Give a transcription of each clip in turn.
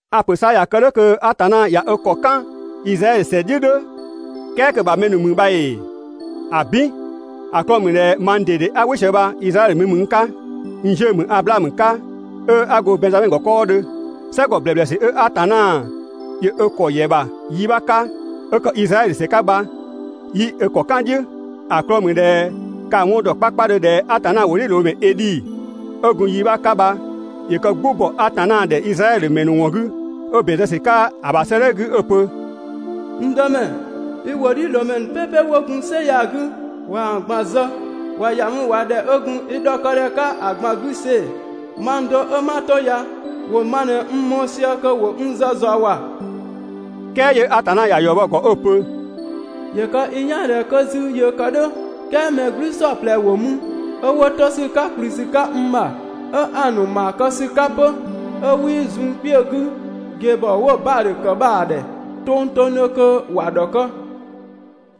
A‑ ‑pö 'sa ꞊ya kë "dhʋ̈ kö Atanna ꞊ya ö ‑kɔ ꞊në "kan Izraɛdhö ‑sɛ "dhiʋ̈ "dhʋ̈, "kɛɛ kö‑ ‑bha mɛ ‑nu ‑mü bha ‑ee? ‑Abin! ‑A 'klɔɔ‑ ‑mü ꞊dhɛ mang ꞊dede 'a "wɩ sië bha Izraɛdhö mi ‑mü n 'ka, n 'ziʋ̈‑ ‑mü Ablaamö 'ka, 'ö 'a go Bɛnngzamɛ ‑gɔ 'kɔɔdhö. "Sɛgɔ ‑blɛblɛsü 'ö Atanna ‑yö ö ‑kɔ ‑yɛ ‑bha yi 'bha 'ka, 'ö ‑kë Izraɛdhö ‑sɛ 'ka bha, 'yii ö ‑kɔ "kan‑ "dhiʋ̈. ‑A 'klɔɔ‑ ‑mü ꞊dhɛ ka‑ 'wɔn ‑dɔ 'kpakpadhö ꞊dhɛ Atanna ‑wʋdhiʋ̈loomɛ Edhi 'ö gun yi 'bha 'ka bha yö kë "gbʋ ‑bɔ Atanna ‑dhɛ Izraɛdhö ‑mɛ ‑nu ‑wɔn 'gü 'ö ‑bɛn zë ‑sü 'ka ‑a ‑bha 'sëëdhɛ 'gü 'ö‑ pö: «N Dëmɛ, i ‑wʋdhiʋ̈loomɛ "pɛpɛ 'wo gun "sɛ ya‑ 'gü, ꞊waa‑ ꞊gban zë, ꞊wa ‑ya mü ꞊wa ‑dhɛ 'ö gun i ‑dhɔkë ‑dhɛ 'ka ‑a ꞊gban 'gü see‑, mang do 'ö 'ma 'to ya ‑wo ma ꞊në n mɔɔ‑ sië kö ‑wo n zë ꞊zɔɔ ‑wa!» "Kɛɛ 'yö Atanna ‑ya ‑yɔ bɔ‑ ‑gɔ 'ö‑ pö: «‑Yö kë i "yaan ꞊dhɛ 'kö 'zü yöö kë "dhʋ̈, "kɛɛ mɛ "gblü "saɔplɛ ‑wo mü 'ö 'wo 'to ‑sü 'ka ‑kplü ‑sü 'ka n ‑bha, 'ö 'a‑ ‑nu ‑maa kë ‑sü 'ka 'pö, 'ö 'wii zun kpiögɔ 'gü ꞊gebhɔ 'wo‑ Baadhö ‑kë bha‑ ‑dhɛ tongtongdhö kö ‑wa ‑dhɔkë.»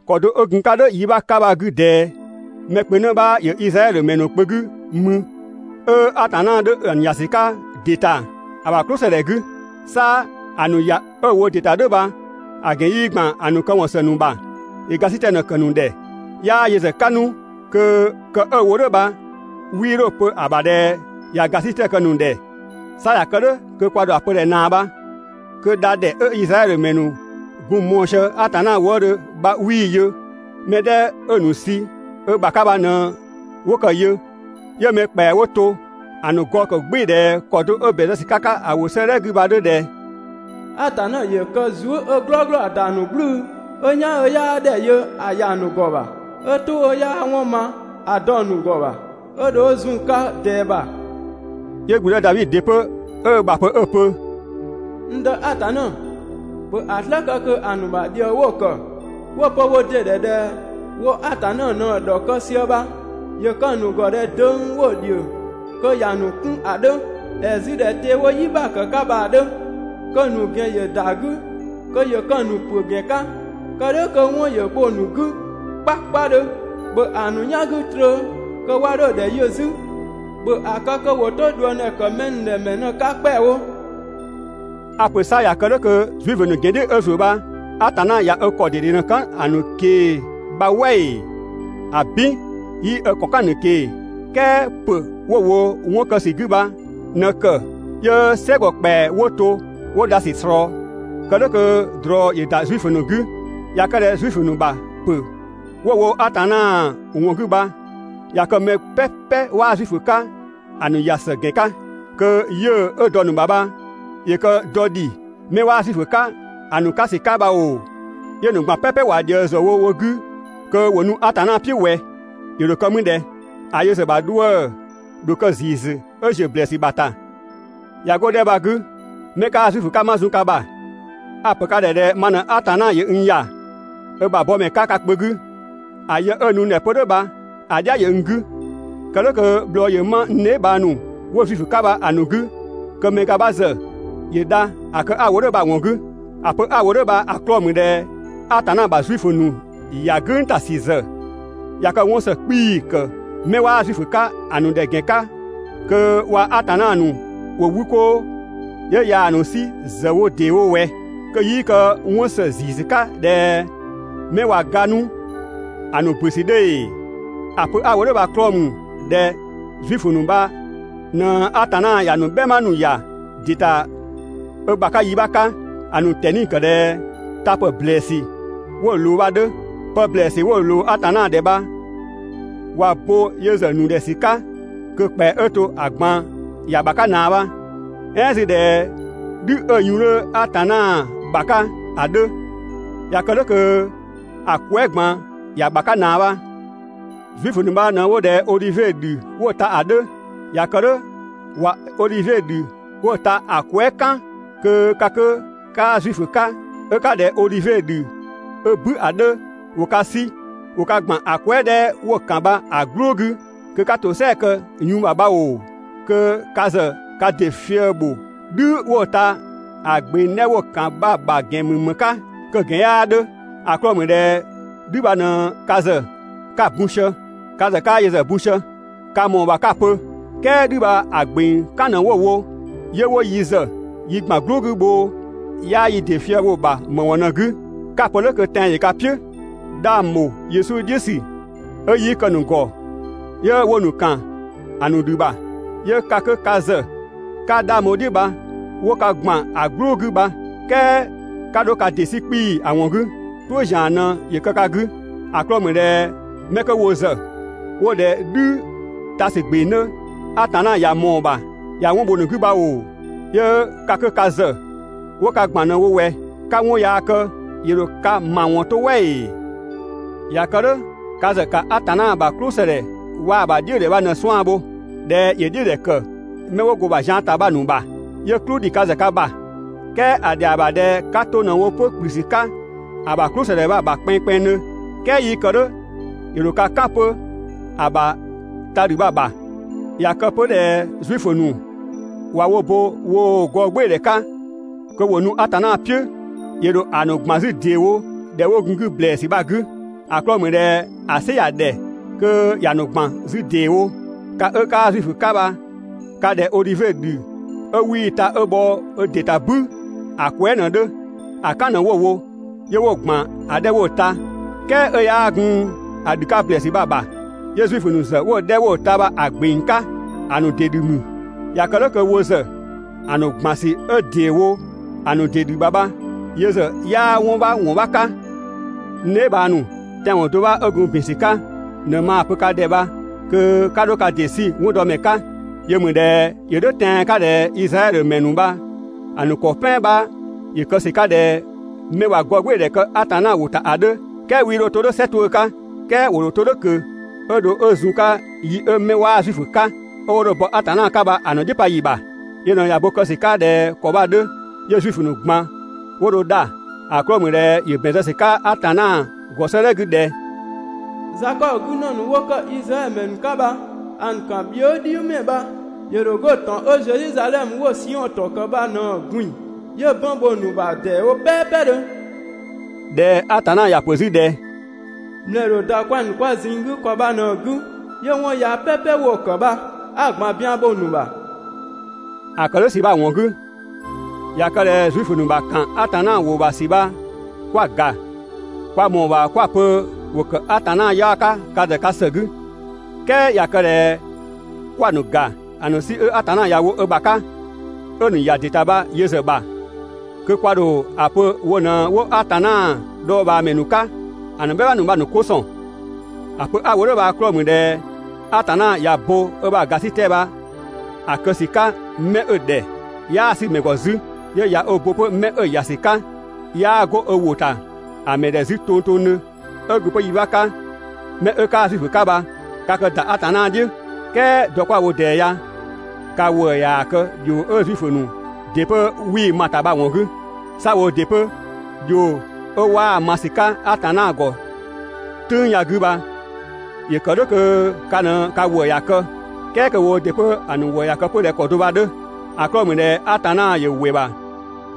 ‑Kɔ do 'ö gun‑ 'ka "dhʋ̈ yi 'bha 'ka bha‑ 'gü ꞊dɛɛ, mɛ kpö 'në 'bha ‑yö Izraɛdhö ‑mɛ ‑nu kpö 'gü mü, 'ö Atanna 'dhö‑ ‑nu ‑ya ‑sü 'ka ‑dɩ ‑ta ‑a ‑bha "klʋ ‑së ‑dhɛ 'gü. 'Sa ‑a ‑nu ‑ya 'ö‑ wo ‑dɩ ‑ta "dhʋ̈ bha, ‑a ‑gɛn 'yii ‑gban ‑a ‑nu këwɔn ‑së ‑nu ‑bha, ‑yö ‑gasitɛ ꞊në‑ ‑kë ‑nu ‑dhɛ, 'yaa yö ‑zë 'ka 'nu kö‑ kë 'ö‑ wo "dhʋ̈ bha 'wii 'dho‑ pö‑ ‑bha ꞊dhɛ ꞊ya ‑gasitɛ kë‑ ‑nu ‑dhɛ. 'Sa ꞊ya kë "dhʋ̈ kö kwa ‑dho ‑a pö ꞊dhɛ ꞊naa bha? Kö dha ‑dhɛ 'ö Izraɛdhö ‑mɛ ‑nu gun‑ mɔɔ‑ sië Atanna wëëdhö bha 'wii‑ yö. Mɛ 'dhɛ 'ö‑ ‑nu sü ö ‑bha 'ka bha ꞊në 'wo kë‑ yö, 'yö mɛ ‑kpɛa 'wo to ‑a ‑nu gɔɔ ‑kë "gbɩɩ‑ ꞊dhɛ ‑kɔ do 'ö ‑bɛn zë ‑sü 'ka‑ 'ka ‑a ‑wʋ 'sëëdhɛ 'gü bha‑ 'dhö ꞊dhɛ: «Atanna ‑yö kë zuë" 'ö "glɔɔglɔ ‑a ‑da ‑nu "gblʋ̈ʋ̈‑, 'ö "yan 'ö 'yaa ‑dhɛ yö ‑a ‑ya ‑a ‑nu ‑gɔ ‑bha, 'ö "tʋ 'ö 'yaa 'wɔn ‑ma ‑a dɔ‑ ‑nu ‑gɔ ‑bha 'ö dho ö zun‑ 'ka ꞊dɛɛ ‑bha.» 'Yö ‑gblüdë Davi ‑dɩ 'pö 'ö ö ‑bha pö 'ö‑ pö: «(N Dë Atanna,) ‑bhö ‑a "slë kë kö ‑a ‑nu ‑bha ‑dhië 'wo‑ ‑kë 'ö 'wo‑ pö wo ‑dɩ ‑dhɛ ꞊dhɛ wo Atanna ꞊në‑ ‑dhɔkë sië bha ‑yö kë‑ ‑nu ‑gɔ ꞊dhɛ döng 'wo‑ ‑dhio kö ‑ya ‑nu 'kun ‑a 'dhö, ‑ɛɛ 'zü ꞊dhɛ te 'wo "yi ‑bha ‑kë 'ka bha‑ 'dhö, kö‑ ‑nu ‑gɛn ‑yö ‑da 'gü kö ‑yö kë‑ ‑nu ‑pö ‑gɛn 'ka, kë "dhʋ̈ kö 'wɔn ‑yö bho‑ ‑nu 'gü 'kpakpadhö. ‑Bhö ‑a ‑nu "yan 'gü trö kö 'wa 'dho ‑dhɛ yö 'zü, ‑bhö ‑a kë kö ‑wo 'to ꞊dhuëngdhɛ ‑kë mɛ ‑nu ‑dhɛ ‑mɛ ꞊në‑ 'ka ‑kpɛawo.» A‑ ‑pö 'sa ꞊ya kë "dhʋ̈ kö Zuifö ‑nu ‑gɛn "dhiʋ̈ 'ö ‑zuö bha Atanna ꞊ya ö ‑kɔ ꞊dede ꞊në‑ "kan‑ ‑nu ꞊kee‑ bha "wɛ ‑ee? ‑Abin! 'Yii ö ‑kɔ "kan‑ ‑nu ꞊kee‑, "kɛɛ ‑pö 'wo‑ wo 'wɔn kë ‑sü 'gü bha ꞊në‑ ‑kë 'yö "sɛgɔ ‑kpɛa 'wo to 'wo dha ‑sü ꞊slɔɔ, kë "dhʋ̈ kö ꞊drɔ ‑yö ‑da Zuifö ‑nu 'gü. ꞊Ya kë ꞊dhɛ Zuifö ‑nu ‑bha ‑pö 'wo‑ wo Atanna ‑wɔn 'gü bha ꞊ya kë mɛ "pɛpɛ 'waa Zuifö 'ka‑ ‑nu ‑ya ‑së ‑gɛn 'ka, kö 'yiʋ̈‑ 'ö dɔ‑ ‑nu ‑bha bha ‑yö kë dɔ ‑dhi 'mɛ 'waa Zuifö 'ka‑ ‑nu 'ka ‑sü 'ka bha ‑oo, 'yö‑ ‑nu ꞊gban "pɛpɛ ꞊wa dhië‑ ‑zë wo wo 'gü kö ‑wo nu Atanna "piʋ̈ ꞊wɛ? ‑Yö ‑dho kë mü ꞊dhɛ? ‑A yö ‑zë ‑bha 'dhuë‑ ‑dho kë ‑ziisü 'ö ‑ziö ‑blɛɛsü ‑bha ‑ta. ꞊Ya 'go‑ 'dhɛ 'kö bha‑ 'gü, 'mɛ 'kaa Zuifö 'ka 'ma zun ka ‑bha. A‑ ‑pö ka ‑dhɛ ꞊dhɛ ma ꞊në Atanna ‑yö n ‑ya ö ‑bha bɔmɛ 'ka ka kpö 'gü, ‑a yë 'ö‑ nu n ‑dhɛ 'pö "dhʋ̈ bha‑ "dhia ‑yö n 'gü. Kë "dhʋ̈ kö bhlɔɔ ‑yö 'ma n dheebhang ‑nu 'wo Zuifö 'ka bha‑ ‑nu 'gü kö‑ mɛ ga 'bha ‑zë ‑yö dha ‑a kë 'a‑ wo "dhʋ̈ bha‑ ‑wɔn 'gü. ‑A pö 'a‑ wo "dhʋ̈ bha‑ 'klɔɔ‑ ‑mü ꞊dhɛ Atanna ‑bha Zuifö ‑nu ‑ya "gʋ̈ng ‑ta ‑sü ‑zë ꞊ya kë 'wɔn ‑së 'kpii‑ ‑kë 'mɛ 'waa Zuifö 'ka‑ ‑nu ‑dhɛ ‑gɛn 'ka kö waa‑ Atanna ‑nu ‑wo 'wü 'koo, 'yö ꞊yaa‑ ‑nu 'sü ‑zë wo ‑dee wo ꞊wɛ? Kö 'yii kë 'wɔn ‑së ‑ziisü 'ka ꞊dhɛ 'mɛ ꞊wa ga 'nu ‑a ‑nu ‑bö ‑sü 'dhö ‑ee? ‑A pö 'a‑ wo "dhʋ̈ bha‑ 'klɔɔ‑ ‑mü ꞊dhɛ Zuifö ‑nu bha ꞊në Atanna ‑ya ‑nu "bhɛma ‑nu ‑ya ‑dɩ ‑ta ö ‑bha 'ka yi 'bha 'ka, ‑a ‑nu ꞊tɛni ‑kë ꞊dhɛ ta ‑pë ‑blɛɛsü 'wo‑ ꞊loo bha‑ 'dhö. Pë ‑blɛɛsü 'wo ꞊loo Atanna ‑dhɛ bha ꞊wa bo yö ‑zë ‑nu ‑dhɛ ‑sü 'ka kö‑ ‑kpɛa 'ö to‑ ꞊gban ‑ya ‑bha 'ka ꞊naa bha. "Ɛɛn 'zü ꞊dhɛ "dhü 'ö‑ yun 'dhö Atanna ‑bha 'ka ‑a 'dhö, ꞊ya kë "dhʋ̈ kö‑ kwɛɛ" ꞊gban ‑ya ‑bha 'ka ꞊naa bha. Zuifö ‑nu bha ꞊në 'wo ꞊dhɛ odhivie ‑dhü 'wo‑ ta ‑a 'dhö, ꞊ya kë "dhʋ̈, ꞊wa odhivie ‑dhü 'wo‑ ta ‑a kwɛɛ" "kan kö ka 'kö 'kaa Zuifö 'ka 'ö 'ka ꞊dhɛ odhivie ‑dhü 'ö "bü ‑a 'dhö, ‑wo ka 'sü ‑wo ka ‑gban ‑a kwɛɛ" 'dhɛ 'wo‑ ‑kan bha‑ "gblʋʋ 'gü kö 'ka ‑tosɛa kë‑ yun bha‑ ‑bha bha ‑oo, kö ka ‑zë ka ‑dɩ fië‑ ‑bho "dhü 'kö 'wo‑ ‑ta ‑a ‑gbeng 'dhɛ 'wo‑ ‑kan bha‑ ‑bha ‑gɛn ‑mü ‑më 'ka? Kö‑ ‑gɛn 'yaa 'dhö, ‑a 'klɔɔ‑ ‑mü ꞊dhɛ "dhü bha ꞊në ka ‑zë ka bun sië, ka ‑zë 'kaa yö ‑zë bun sië. Ka ‑mɔɔ ‑bha 'ka‑ pö ꞊dhɛ: "Kɛɛ "dhü bha‑ ‑gbeng "kan ꞊në 'wo‑ wo 'yö 'wo yi ‑zë yi ‑gban "gblʋʋ 'gü bhoo, ('yaa yi ‑dɩ fië‑ bho‑ ‑bha ‑më ‑wɔn ꞊në‑ 'gü?) 'Ka‑ pö "dhʋ̈ kö tɛan‑ ‑yö ka "piʋ̈, 'dhang ‑bho Yesu "dhiʋ̈ ‑sü 'ö 'yii kë‑ ‑nu ‑gɔ 'yö 'wo‑ ‑nu ‑kan ‑a ‑nu ‑dhü ‑bha, 'yö ka 'kö ka ‑zë 'ka 'dhang bho‑ "dhiʋ̈ bha, 'wo ka ‑gban ‑a "gblʋʋ 'gü bha, "kɛɛ 'ka 'dho ka ‑dɩ 'sü 'kpii‑ ‑a ‑wɔn 'gü, "suʋ̈ ‑zian ꞊në ‑yö kë ka 'gü. ‑A 'klɔɔ‑ ‑mü ꞊dhɛ mɛ 'kö wo ‑zë 'wo ꞊dhɛ "dhü ta ‑sü gbeng 'dhö, Atanna ꞊ya ꞊mɔɔ‑ ‑bha ꞊ya 'wɔn bho‑ ‑nu 'gü bha ‑oo, 'yö ka 'kö ka ‑zë 'wo ka ‑gban ꞊në‑ wo ꞊wɛ, 'ka 'wɔn yaa kë, ‑yö ‑dho ka ‑mawɔn 'to "wɛ ‑ee? ꞊Ya kë "dhʋ̈, ka ‑zë ‑ka Atanna ‑bha "klʋsëdhɛ waa‑ ‑bha "dhiʋ̈dhɛ bha ꞊në‑ 'suan‑ bho. ꞊Dhɛ ‑yö "dhiʋ̈dhɛ ‑kë 'mɛ 'wo go‑ ‑bha zian ‑ta bha‑ ‑nu ‑bha, 'yö "klʋ ‑dhi ka ‑zë ka ‑bha, "kɛɛ ‑a ‑dhɛa ‑bha ꞊dhɛ 'ka 'to ꞊në wo 'pö ‑kplü ‑sü 'ka ‑a ‑bha "klʋsëdhɛ bha‑ ‑bha kpɛnngkpɛnngdhö. "Kɛɛ 'yii kë "dhʋ̈, ‑yö ‑dho ka "kan 'pö ‑a ‑bha ta ‑dhü bha‑ ‑bha. ꞊Ya kë 'pö ꞊dhɛ Zuifö ‑nu ꞊wa wo bo woo‑ gɔɔgbɩɩdhɛ 'ka kö ‑wo nu Atanna "piʋ̈, ‑yö ‑dho ‑a ‑nu ‑gban 'zü ‑deewo ‑dhɛ 'wo gun‑ 'gü ‑blɛɛsü bha‑ 'gü. ‑A 'klɔɔ‑ ‑mü ꞊dhɛ ‑a "sɩ ‑ya ‑dhɛ kö ‑ya ‑nu ‑gban 'zü ‑deewo. Ka 'ö 'kaa Zuifö 'ka bha ka ꞊dhɛ odhivie ‑dhü 'ö 'wii‑ ta 'ö bhɔ ö ‑dɩ ‑ta "bü ‑a kwɛɛ" ꞊në‑ 'dhö. ‑A "kan ꞊në 'wo‑ wo 'yö 'wo‑ ‑gban ‑a 'dhɛ 'wo‑ ta, "kɛɛ 'ö 'yaa gun ‑a ‑dhü 'ka ‑blɛɛsü bha‑ ‑bha. 'Yö Zuifö ‑nu ‑zë 'wo‑ 'dhɛ 'wo‑ ta bha‑ ‑gbeng 'ka, ‑a ‑nu ‑dɩ ‑dhü ‑mü. ꞊Ya kë "dhʋ̈ kö wo ‑zë ‑a ‑nu ‑gban ‑sü 'ö ‑deewo ‑a ‑nu ‑dɩ ‑dhü bha‑ ‑bha bha yö ‑zë 'yaa 'wɔn 'bha ‑wɔn 'bha 'ka. N dheebhang ‑nu, tɛanwɔn do 'bha 'ö gun ‑bin ‑sü 'ka ꞊në maa‑ pö ka ‑dhɛ bha kö 'ka 'dho ka ‑dɩ 'sü 'wɔndɔmɛ 'ka. Yö ‑mü ꞊dhɛ ‑yö "dhʋ̈ tɛan‑ 'ka ꞊dhɛ Izraɛdhö ‑mɛ ‑nu bha‑ ‑nu ‑kɔ "pɛan 'bha ‑yö kë ‑sü 'ka ꞊dhɛ 'mɛ ꞊wa gɔɔgbɩɩdhɛ kë Atanna ‑wʋ ‑ta ‑a 'dhö, "kɛɛ 'wii 'dho 'to "dhʋ̈ "sɛ 'tuʋ̈‑ 'ka. "Kɛɛ ‑wo ‑dho 'to "dhʋ̈ ꞊kö 'ö dho 'ö zun‑ 'ka yi 'ö 'mɛ 'waa Zuifö 'ka 'ö 'wo dho bɔ Atanna 'ka bha ‑a ‑nu "dhiʋ̈ pa ‑yi ‑bha. Yö ꞊në ꞊ya bo kë ‑sü 'ka ꞊dhɛ ‑kɔ bha‑ 'dhö, 'yö Zuifö ꞊gban 'wo dho dha, ‑a 'klɔɔ‑ ‑mü ꞊dhɛ ‑yö ‑bɛn zë ‑sü 'ka Atanna ‑gɔ 'sëëdhɛ 'gü ꞊dhɛ «Zakɔbö 'gü ‑në ‑nu 'wo ‑kë Izraɛdhö ‑mɛ ‑nu 'ka bha, ‑a ‑nu ‑kan bhië" "dhiʋ̈ mɛ bha ‑yö ‑dho 'go ‑tɔn 'ö Zedhizadhɛmö 'wo‑ Siɔn ‑tɔn ‑kë bha ꞊në‑ ꞊gbin‑, 'yö bɔn bho‑ ‑nu ‑bha ‑deewo "pɛɛpɛdhö.» ꞊Dhɛ Atanna ‑ya ‑pö 'zü ꞊dhɛ: «‑Mlɛɛ ‑dho ‑da kwɛng‑ ‑nu kwa ꞊zinng 'gü ‑kɔ bha ꞊në‑ 'gü, 'yö 'wɔn yaya "pɛpɛ 'wo‑ ‑kë bha, 'a‑ ꞊gban bian bho‑ ‑nu ‑bha.» ‑A ‑kë "dhʋ̈ ‑sü bha‑ ‑wɔn 'gü, ꞊ya kë ꞊dhɛ Zuifö ‑nu ‑bha ‑kan Atanna ‑wʋ ‑bha ‑sü bha 'kwa‑ ‑ga, kwa ‑mɔɔ ‑bha 'kwa‑ pö ‑wo ‑kë Atanna 'yaɔ‑ 'ka ka ‑zë ka ‑së 'gü, "kɛɛ ꞊ya kë ꞊dhɛ 'kwa‑ ‑nu ‑ga ‑a ‑nu 'sü 'ö Atanna ‑ya wo ö ‑bha 'ka, 'ö‑ ‑nu ‑ya ‑dɩ ‑ta bha yö ‑zë ‑bha, kö kwa ‑dho ‑a pö wo ꞊në 'wo Atanna dhɔɔbhaamɛ ‑nu 'ka ‑a ‑nu "bhɛma ‑nu bha‑ ‑nu 'ko ‑sɔn. ‑A pö 'a‑ wo "dhʋ̈ bha‑ 'klɔɔ‑ ‑mü ꞊dhɛ Atanna ꞊ya bo ö ‑bha ‑gasitɛ bha‑ kë ‑sü 'ka 'mɛ 'ö‑ ‑dhɛ 'yaa‑ 'sü‑ ‑mɛ ‑gɔ 'zü, 'yö ꞊ya ö bo 'pö 'mɛ 'ö‑ ‑ya ‑sü 'ka, 'yaa 'go ö ‑wʋ ‑ta ‑a ‑mɛ ‑dhɛ 'zü tongtongdhö. 'Ö gun 'pö yi 'bha 'ka, 'mɛ 'ö 'kaa Zuifö 'ka bha ka kë ‑da Atanna "dhiʋ̈, "kɛɛ dɔ 'kwa‑ wo ꞊dɛɛ ya ka ‑wëë ꞊yaa‑ kë ‑dhio 'ö Zuifö ‑nu ‑dɩ 'pö 'wii‑ ma‑ ‑ta bha‑ ‑wɔn 'gü. 'Sa woo ‑dɩ 'pö, ‑dhio 'ö 'waa‑ ma ‑sü 'ka Atanna ‑gɔ "tʋ̈ng ya‑ 'gü bha, ‑yö ‑kë "dhʋ̈ kö ka ꞊në ka ‑wëë ‑ya kë, "kɛɛ kö woo ‑dɩ 'pö‑ ‑nu ‑wëë ‑ya kë 'pö ꞊dhɛ ‑kɔ do bha‑ 'dhö. ‑A 'klɔɔ‑ ‑mü ꞊dhɛ Atanna ‑yö ‑wɩ ‑bha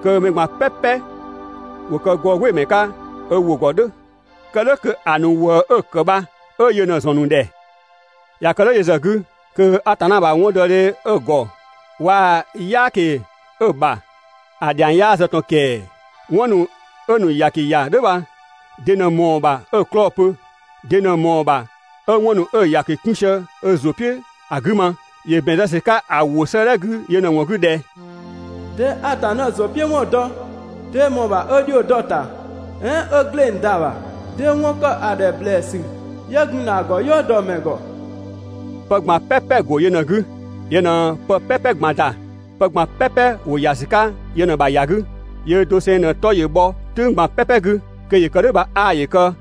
kö mɛ ꞊gban "pɛpɛ ‑wo kë gɔɔgbɩɩmɛ 'ka ö ‑wʋ ‑gɔ "dhʋ̈, kë "dhʋ̈ kö‑ ‑nu ‑wëë 'ö‑ ‑kë bha 'ö yö ꞊në‑ ‑zɔn ‑nu ‑dhɛ. ꞊Ya kë "dhʋ̈ yö ‑zë 'gü, kö Atanna ‑bha 'wɔndɔdhe 'ö‑ ‑gɔ waa‑ "yaaki 'ö‑ ‑bha ‑a ‑dhiang 'yaa zë ꞊tɔn ‑kɛɛ! 'Wɔn ‑nu 'ö‑ ‑nu ‑yaki ‑ya "dhʋ̈ bha, de ꞊në ꞊mɔɔ‑ ‑bha 'ö‑ 'klɔɔ‑ pö? De ꞊në ꞊mɔɔ‑ ‑bha 'ö 'wɔn ‑nu 'ö‑ ‑yaki 'kun sië ö ‑zʋ "piʋ̈ ‑a 'gü ma? ‑Yö ‑bɛn zë ‑sü 'ka‑ ‑wʋ 'sëëdhɛ 'gü yö ꞊në‑ ‑wɔn 'gü ꞊dhɛ: «'Dee Atanna ‑zʋ "piʋ̈ ‑wɔn dɔ? 'Dee ꞊mɔɔ‑ ‑bha 'ö ‑dhio dɔ‑ ‑ta? "Ɛɛn 'ö ‑gleng ‑da ‑bha? 'Dee 'wɔn ‑kë ‑a ‑dhɛ ‑blɛɛsü 'yö gun ‑na ‑a ‑gɔ "yɔɔ dɔ‑ ‑mɛ ‑gɔ?» Pë ꞊gban "pɛpɛ‑ ‑go yö ꞊në‑ 'gü, yö ꞊në pë "pɛpɛ ꞊gban ‑da, pë ꞊gban "pɛpɛ ‑wo ‑ya ‑sü 'ka yö ꞊në‑ ‑bha ‑ya 'gü. Yöö dosengseng ꞊në‑ 'tɔ ‑yö bhɔ "tʋ̈ng ꞊gban "pɛpɛ 'gü. Kö ‑yö kë "dhʋ̈ bha 'aa ‑yö kë.